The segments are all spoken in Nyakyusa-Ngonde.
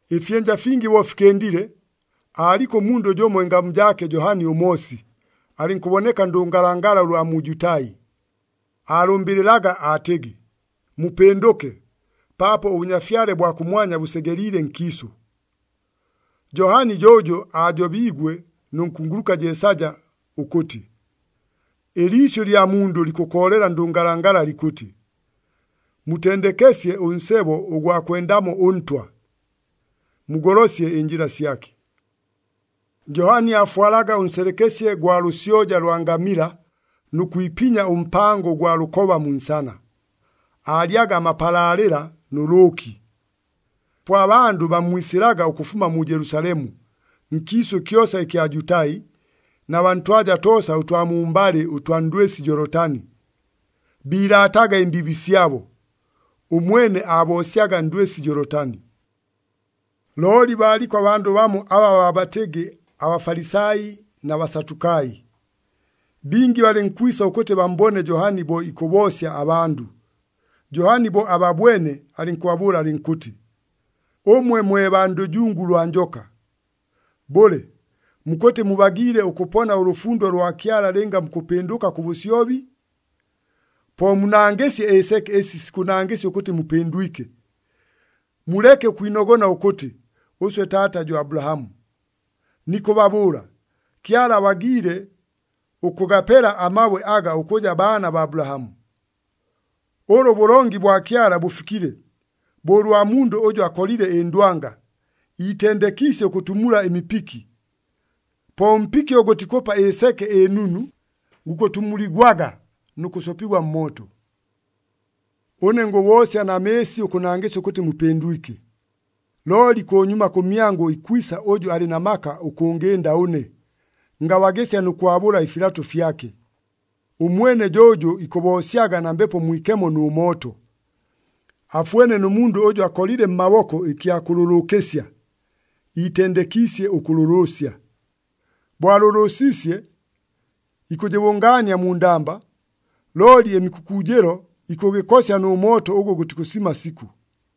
Ɨfyɨnja fingi bo fikɨndile, aaliko ʉmundʉ jʉmo ɨngamu jaake Johani ʉMoosi, alɨnkʉboneka ndʉngalangala ʉlwa mu Jutai. Aalʉmbɨlɨlaga aatɨgɨ, “Mupɨndʉke, paapo ʉBʉnyafyale bwa kʉmwanya bʉsegeliile nkiisʉ.” Johani jo ʉjʉ aajobiigwe nʉ nkunguluka Jeesaja ʉkʉtɨ, “Ɨliisyʉ lya mundʉ likʉkoolela ndʉngalangala likʉtɨ, ‘Mutendekesye ʉnsebo ʉgwa kwendamo ʉNtwa! Mugolosye ɨnjɨla syake!’” Johani aafwalaga ʉnselekesye gwa lʉsyoja lwa ngamila nʉ kwipinya ʉmpango ʉgwa lʉkoba mu nsana, aalyaga amapalaalɨla nʉ lʉʉki. Po abandʉ bammwisɨlaga ʉkʉfuma mu Jelusalemu, nkiisʉ kyosa ɨkya Jutai na baa ntwaja toosa ʉtwa mumbalɨ ʉtwa ndwɨsi Jolitani. Biilaataga ɨmbiibi syabo, ʉmwene aaboosyaga ndwɨsi Jolitani. Looli baaliko abandʉ bamo aba baabatɨgɨ aBafalisai na Basatukai. Bingi balɨnkwisa ʉkʉtɨ bammbone Johani bo ikʉboosya abandʉ. Johani bo ababwene alɨnkʉbabʉʉla alɨnkʉtɨ, “Ʉmwe mwe baa ndʉjungu lwa njoka! Bʉle, mukʉtɨ mubagiile ʉkʉpona ʉlʉfundo lwa Kyala lɨnga mukʉpɨndʉka kʉ bʉsyobi? Po munangɨsye ɨseke ɨsi sikʉnangɨsya ʉkʉtɨ mupɨndwike. Muleke ʉkwinogona ʉkʉtɨ, ‘Ʉswe taata jo Abulahamu.’ Nikʉbabʉʉla, Kyala abagiile ʉkʉgapela amabwe aga ʉkʉja baana baa Abulahamu! Ʉlʉ ʉbʉlongi bwa Kyala bʉfikile, bo ʉlwa mundʉ ʉjʉ akolile ɨndwanga, iitendekiisye ʉkʉtumula ɨmipiki. Po ʉmpiki ʉgʉ gʉtikʉpa ɨseke ɨnunu, gukʉtumuligwaga nʉ kʉsopigwa mmooto. “Ʉne ngʉboosya na mɨɨsi ʉkʉnangɨsya ʉkʉtɨ mupɨndwike. Looli kʉnyuma kʉmyangʉ ikwisa ʉjʉ alɨ na maka ʉkʉngɨnda ʉne, ngabagɨsya nʉ kwabʉla ɨfilato fyake. Ʉmwene jo ʉjʉ ikʉboosyaga na Mbepo Mwikemo nʉ mooto. Afwene nʉ mundʉ ʉjʉ akolile mmaboko ɨkya kʉlʉlʉʉkɨsya, iitendekiisye ʉkʉlʉlʉʉsya. Bo alʉlʉʉsiisye, ikʉbʉngaania mu ndamba, looli ɨmikʉkʉʉjɨlo ikʉgɨkosya nʉ mooto ʉgʉ gʉtikʉsima sikʉ.”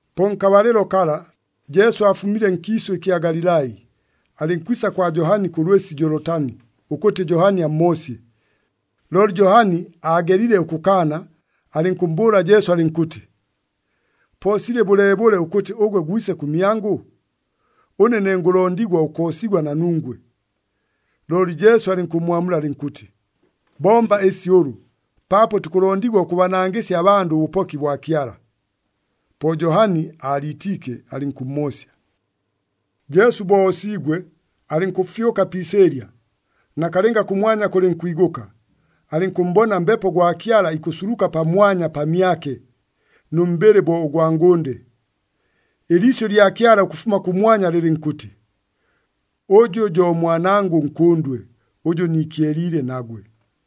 Po nkabalɨlo kala, Jesu aafumile nkiisʉ ɨkya Galilai, alɨnkwisa kwa Johani kʉ lwɨsi Jolitani, ʉkʉtɨ Johani ammoosye. Looli Johani aagelile ʉkʉkaana, alɨnkʉmmbʉʉla Jesu alɨnkʉtɨ, “Po silɨ bʉleebʉle ʉkʉtɨ ʉgwe gwise kʉmyangʉ? Ʉne ne ngʉlondigwa ʉkoosigwa na nungwe.” Looli Jesu alɨnkʉmmwamula alɨnkʉtɨ, “Bomba ɨsi ʉlʉ, paapo tukʉlondigwa ʉkʉbanangɨsya abandʉ ʉbʉpoki bwa Kyala.” Po Johani aaliitiike, alɨnkʉmmoosya. Jesu bo oosiigwe, alɨnkʉfyʉka pi isɨɨlya. Nakalɨnga kʉmwanya kʉlɨnkwigʉka, alɨnkʉmmbona Mbepo gwa Kyala ikʉsuluka pamwanya pamyake, nʉ mbɨlɨ bo ʉgwa ngʉnde. Ɨliisyʉ lya Kyala ʉkʉfuma kʉmwanya, lɨlɨnkʉtɨ, “Ʉjʉ jo Mwanangʉ ʉNkʉndwe, ʉjʉ niikyeliile nagwe.”